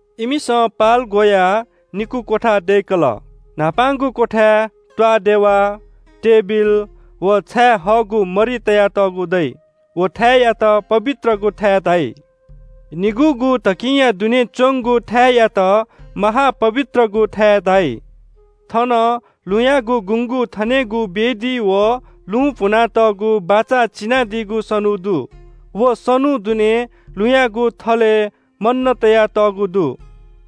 इमिसं पाल ग्‍वयाः निकू क्‍वथा दय्‌कल। न्‍हापांगु क्‍वथाय् त्‍वाःदेवा, तेबिल व छायेहःगु मरि तयातःगु दइ। व थाय्‌यात पवित्रगु थाय् धाइ। निगूगु धकिंया दुने च्‍वंगु थाय्‌यात महा-पवित्रगु थाय् धाइ। थन लुँयागु गुँगू थनेगु वेदी व लुं भुनातःगु बाचा चिनादीगु सनू दु। व सनू दुने लुँयागु थलय् मन्‍न तयातःगु दु,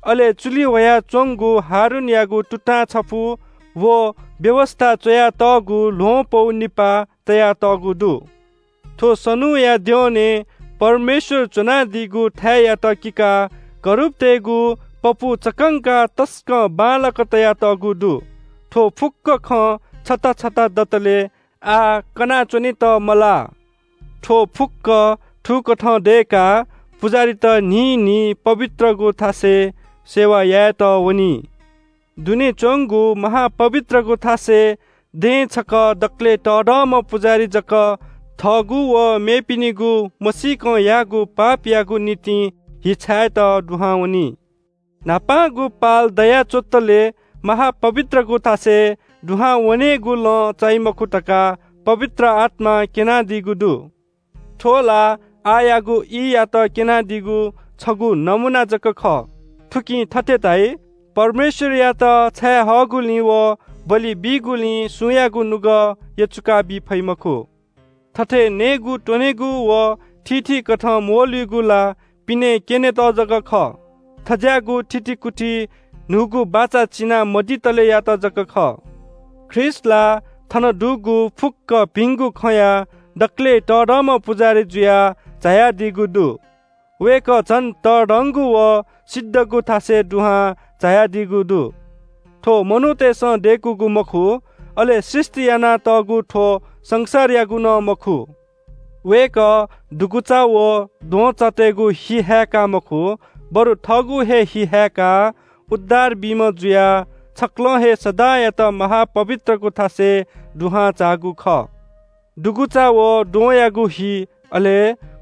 अले चुलि ह्वयाच्‍वंगु हारूनयागु तुतां छपु, व व्‍यवस्‍था च्‍वयातःगु ल्‍वहं पौ निपाः तयातःगु दु। थ्‍व सनूया द्यःने परमेश्‍वर च्‍वनादीगु थाय्‌यात किकाः करूबतय्‌गु पपू चक्‍कंकाः तसकं बांलाक तयातःगु दु। थ्‍व फुक्‍क खँ छता छता दतले आः कना च्‍वनेत मलाः। थ्‍व फुक्‍क थुकथं दय्‌काः पुजाहारीत न्‍हिं न्‍हिं पवित्रगु थासय् सेवा यायेत वनी। दुने च्‍वंगु महा-पवित्रगु थासय् दँय् छकः दकलय् तःधंम्‍ह पुजाहारी जक थःगु व मेपिनिगु मसीकं याःगु पापयागु निंतिं हि छायेत दुहां वनी। न्‍हापांगु पाल दयाच्‍वंतले महा-पवित्रगु थासय् दुहां वनेगु लँ चाइ मखु धकाः पवित्र आत्‍मां क्‍यनादीगु दु। थ्‍व ला आःयागु ईयात क्‍यनादीगु छगू नमूना जक खः। थुकिं थथे धाइ – परमेश्‍वरयात छाये हःगुलिं व बलि बीगुलिं सुयागुं नुगः यचुकाबी फइ मखु। थथे नयेत्‍वनेगु व थीथी कथं म्‍वःल्‍हुइगु ला पिने क्‍यनेत जक खः। थज्‍याःगु थितिकुति न्‍हूगु बाचा चिना मदीतलेयात जक खः। ख्रीष्‍ट ला थन दुगु फुक्‍क भिंगु खँया दकलय् तःधंम्‍ह पुजाहारी जुयाः झायादीगु दु। वय्‌कः झन तःधंगु व सिद्धगु थासय् दुहां झायादीगु दु। थ्‍व मनूतय्‌सं दय्‌कूगु मखु, अले सृष्‍टि यानातःगु थ्‍व संसारयागु नं मखु। वय्‌कः दुगुचा व द्वहंचातय्‌गु हि हाय्‌काः मखु, बरु थःगु हे हि हाय्‌काः उद्धार बीम्‍ह जुयाः छकलं हे सदांयात महा-पवित्रगु थासय् दुहां झाःगु खः। दुगुचा व द्वहंयागु हि, अले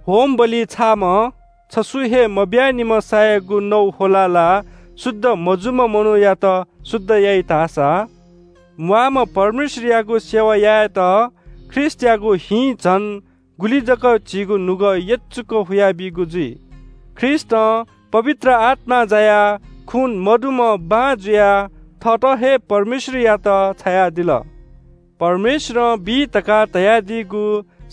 होमबलिइ छाःम्‍ह छसु हे मब्‍यानिम्‍ह सायागु नौ ह्वलाः ला शुद्ध मजूम्‍ह मनूयात शुद्ध याइ धाःसा म्‍वाःम्‍ह परमेश्‍वरयागु सेवा यायेत ख्रीष्‍टयागु हिं झन गुलि जक झीगु नुगः यचुक हुया बीगु जुइ? ख्रीष्‍टं पवित्र आत्‍मां जायाः खू मदुम्‍ह बां जुयाः थःत हे परमेश्‍वरयात छायादिल। परमेश्‍वरं बी धकाः धयादीगु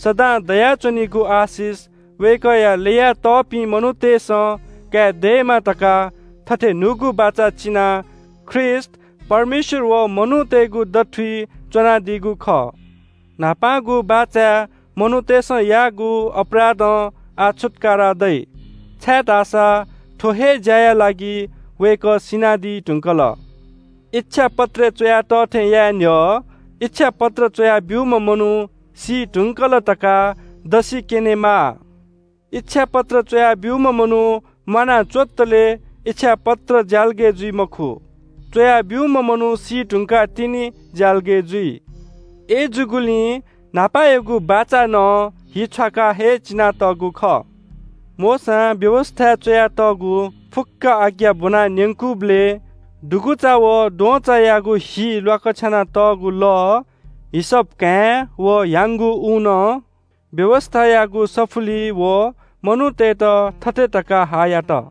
सदां दयाच्‍वनीगु आशिष वय्‌कःया ल्‍ययातःपिं मनूतय्‌सं काये दयेमा धकाः थथे न्‍हूगु बाचा चिनाः ख्रीष्‍ट परमेश्‍वर व मनूतय्‌गु दथुइ च्‍वनादीगु खः। न्‍हापांगु बाचाय् मनूतय्‌सं याःगु अपराधं आः छुत्‍कारा दइ, छाय्‌धाःसा थ्‍व हे ज्‍याया लागि वय्‌कः सिनादी धुंकल। इच्‍छापत्रय् च्‍वया तः थें याये न्‍ह्यः इच्‍छापत्र च्‍वया ब्‍यूम्‍ह मनू सी धुंकल धकाः दसि क्‍यनेमाः। इच्‍छापत्र च्‍वया ब्‍यूम्‍ह मनू म्‍वाना च्‍वंतले इच्‍छापत्र ज्‍यालगय् जुइ मखु। च्‍वया ब्‍यूम्‍ह मनू सीधुंकाः तिनि ज्‍यालगय् जुइ। अय्‌जूगुलिं न्‍हापायागु बाचा नं हि छ्वाकाः हे चिनातःगु खः। मोशां व्‍यवस्‍थाय् च्‍वयातःगु फुक्‍क आज्ञा ब्‍वना न्‍यंकूबलय् दुगुचा व द्वहंचायागु हि ल्‍वाकछ्यानातःगु लः, हिसप घाँय् व ह्याउँगु ऊनं व्‍यवस्‍थायागु सफुलिइ व मनूतय्‌त थथे धकाः हा यात –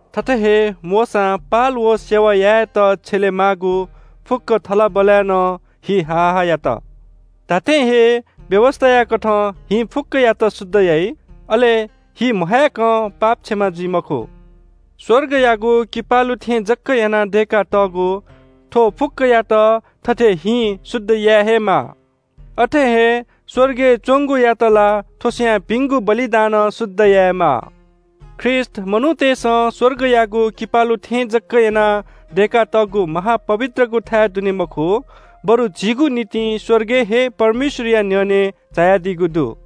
थथे हे मोशां पाल व सेवा यायेत छ्यलेमाःगु फुक्‍क थलबलय् नं हिं हा हा यात। धात्‍थें हे व्‍यवस्‍थायाकथं हिं फुक्‍कयात शुद्ध याइ, अले हि महाय्‌कं पाप क्षमा जुइ मखु। स्‍वर्गयागु किपालु थें जक यानाः दय्‌कातःगु थ्‍व फुक्‍कयात थथे हिं शुद्ध याये हे माः। अथे हे स्‍वर्गय् च्‍वंगुयात ला थ्‍व स्‍वयाः भिंगु बलिदानं शुद्ध यायेमाः। ख्रीष्‍ट मनूतय्‌सं स्‍वर्गयागु किपालु थें जक यानाः दय्‌कातःगु महा-पवित्रगु थाय् दुने मखु, बरु झीगु निंतिं स्‍वर्गय् हे परमेश्‍वरया न्‍ह्यःने झायादीगु दु।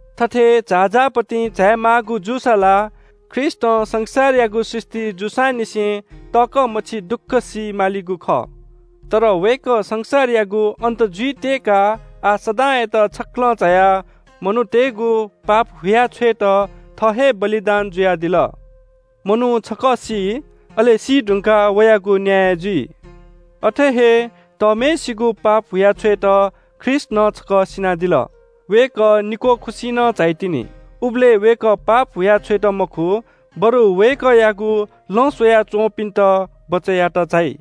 थथे झाःझाः पतिं झायेमाःगु जूसा ला ख्रीष्‍टं संसारयागु सृष्‍टि जूसांनिसें तःकः मछि दुःख सी मालिगु खः। तर वय्‌कः संसारयागु अन्‍त जुइ त्‍यय्‌काः आः सदांयात छकलं झायाः मनूतय्‌गु पाप हुया छ्वयेत थः हे बलिदान जुयादिल। मनू छकः सी, अले सीधुंकाः वयागु न्‍याय जुइ। अथे हे तःम्‍हय्‌सिगु पाप हुया छ्वयेत ख्रीष्‍ट नं छकः सिनादिल। वय्‌कः निक्‍वः खुसि नं झाइतिनि। उबलय् वय्‌कः पाप हुया छ्वयेत मखु, बरु वय्‌कःयागु लँ स्‍वयाच्‍वंपिन्‍त बचय् यायेत झाइ।